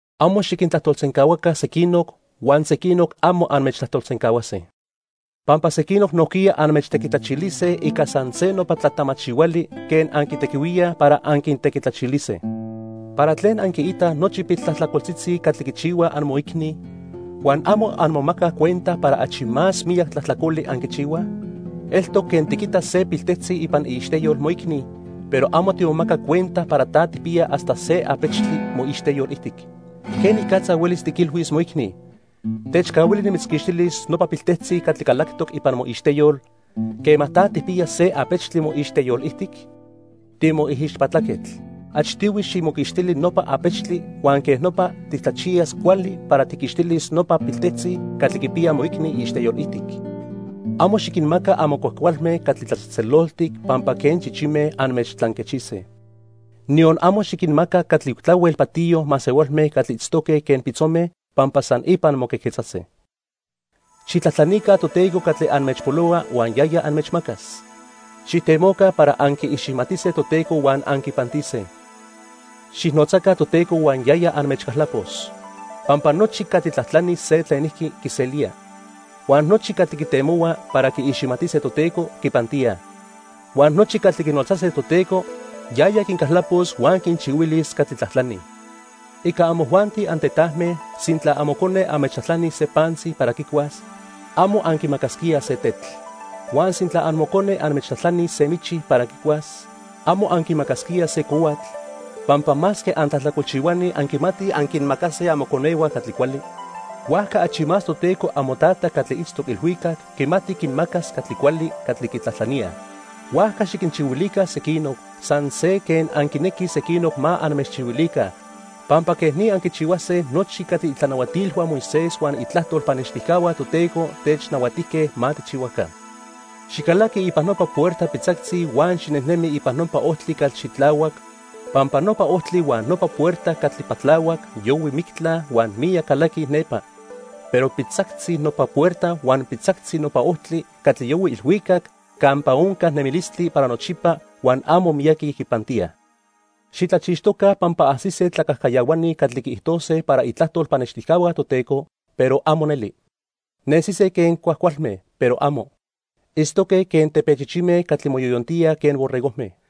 "Amo xiquintlajtolsencahuaca sequinoc, huan sequinoc amo anmechtlajtolsencahuase. Pampa sequinoc nojquiya anmechtequitlachilise ica san se nopa tlatamachihuali quen anquitequihuíaj para anquintequitlachilise. ¿Para tlen anquiitaj nochi piltlajtlacoltzitzi catli quichihua amoicni huan amo anmomacaj cuenta para achi más miyac tlajtlacoli anquichihuaj? Eltoc quen tiquita se piltejtzi ipan iixteyol moicni, pero amo timomaca cuenta para ta tijpiya hasta se apechtli moixteyol ijtic. ¿Quenicatza huelis tiquilhuis moicni: 'Techcahuili nimitzquixtilis nopa piltejtzi catli calactoc ipan moixteyol', quema ta tijpiya se apechtli moixteyol ijtic? Timoijixpatlaquetl, achtihui ximoquixtili nopa apechtli, huan quej nopa titlachiyas cuali para tijquixtilis nopa piltejtzi catli quipiya moicni iixteyol ijtic. "Amo xiquinmaca amo cuajcualme catli tlatzejtzeloltic pampa quen chichime anmechtlanquechise. Niyon amo xiquinmaca catli tlahuel patiyo masehualme catli itztoque quen pitzome, pampa san ipan moquejquetzase. "Xijtlajtlanica Toteco catli anmechpolohua huan yaya anmechmacas. Xijtemoca para anquiiximatise Toteco huan anquipantise. Xijnotzaca Toteco huan yaya anmechcaltlapos. Pampa nochi catli tlajtlanij se tlenijqui, quiselíaj. Huan nochi catli quitemohuaj para quiiximatise Toteco, quipantíaj. Huan nochi catli quinotzase Toteco, yaya quincaltlapos huan quinchihuilis catli tlajtlanij. "Ica amojuanti antetajme, sintla amocone anmechtlajtlanis se pantzi para quicuas, amo anquimacasquíaj se tetl. Huan sintla amocone anmechtlajtlanis se michi para quicuas, amo anquimacasquíaj se cohuatl, pampa masque antlajtlacolchihuani anquimatij anquinmacase amoconehua catli cuali. Huajca achi más Toteco amoTata catli itztoc ilhuicac quimati quinmacas catli cuali catli quitlajtlaníaj. "Huajca xiquinchihuilica sequinoc, san se quen anquinequij sequinoc ma anmechchihuilica. Pampa quej ni anquichihuase nochi catli itlanahuatilhua Moisés huan itlajtol pannextijcahua Toteco technahuatijque ma tijchihuaca. "Xicalaqui ipan nopa puerta pitzactzi huan xinejnemi ipan nopa ojtli catli xitlahuac, pampa nopa ojtli huan nopa puerta catli patlahuac yohui mictla huan miyac calaquij nepa. Pero pitzactzi nopa puerta huan pitzactzi nopa ojtli catli yohui ilhuicac campa onca nemilistli para nochipa huan amo miyaqui quipantíaj. "Xitlachixtoca pampa ajsise tlacajcayahuani catli quiijtose para itlajtol pannextijcahua Toteco, pero amo neli. Nesise quen cuajcualme, pero amo. Itztoque quen tepechichime catli moyoyontíaj quen borregojme.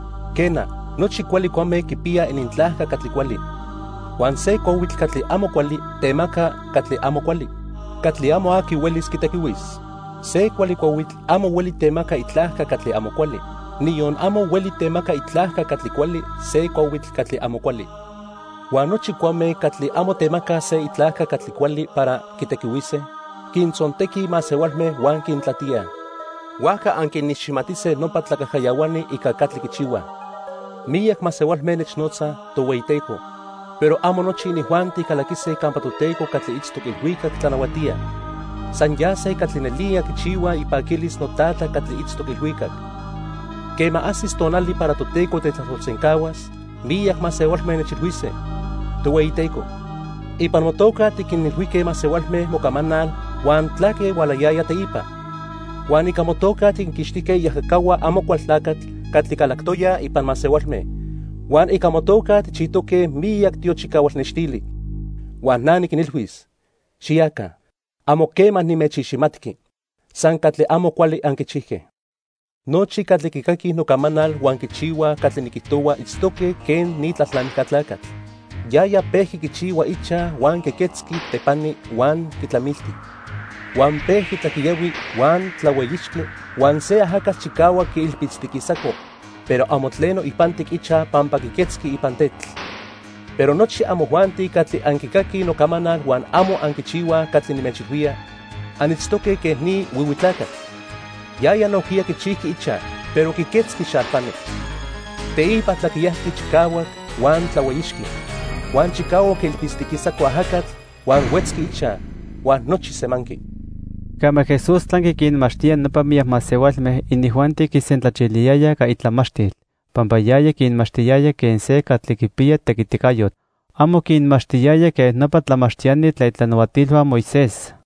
Quena, nochi cuali cuame quipiyaj inintlajca catli cuali. Huan se cuahuitl catli amo cuali temaca catli amo cuali, catli amo aqui huelis quitequihuis. Se cuali cuahuitl amo hueli temaca itlajca catli amo cuali, niyon amo hueli temaca itlajca catli cuali se cuahuitl catli amo cuali. Huan nochi cuame catli amo temacaj se itlajca catli cuali para quitequihuise, quintzontequij masehualme huan quintlatíaj. Huajca anquiniximatise nopa tlacajcayahuani ica catli quichihuaj. "Miyac masehualme nechnotzaj: 'Tohueyiteco', pero amo nochi inijuanti calaquise campa Toteco catli itztoc ilhuicac tlanahuatía. San yase catli nelía quichihuaj ipaquilis noTata catli itztoc ilhuicac. Quema ajsis tonali para Toteco tetlajtolsencahuas, miyac masehualme nechilhuise: 'Tohueyiteco, ipan motoca tiquinilhuijque masehualme mocamanal huan tlaque hualayaya teipa, huan ica motoca tiquinquixtijque iajacahua Amocualtlacatl catli calactoyaj ipan masehualme, huan ica motoca tijchijtoque miyac tiochicahual nextili.' Huan na niquinilhuis: 'Xiyaca. Amo quema nimechiximatqui. San catli amo cuali anquichijque.' "Nochi catli quicaquij nocamanal huan quichihuaj catli niquijtohua itztoque quen ni tlalnamijca tlacatl. Yaya pejqui quichihua ichaj huan quiquetzqui tepani huan quitlamilti. Huan pejqui tlaquiyahui huan tlahueyixqui, huan se ajacatl chicahuac quiilpitztiquisaco, pero amo tleno ipantic ichaj pampa quiquetzqui ipan tetl. Pero nochi amojuanti catli anquicaquij nocamanal huan amo anquichihuaj catli nimechilhuía, anitztoque quen ni huihui tlacatl. Yaya nojquiya quichijqui ichaj, pero quiquetzqui xalpani. Teipa tlaquiyajqui chicahuac huan tlahueyixqui. Huan chicahuac quiilpitztiquisaco ajacatl huan huetzqui ichaj; huan nochi semanqui." Quema Jesús tlanqui quinmachtía nopa miyac masehualme, inijuanti quisentlachiliyayaj ica itlamachtil, pampa yaya quinmachtiyaya quen se catli quipiya tequiticayotl. Amo quinmachtiyaya quen nopa tlamachtiani tlen itlanahuatilhua Moisés.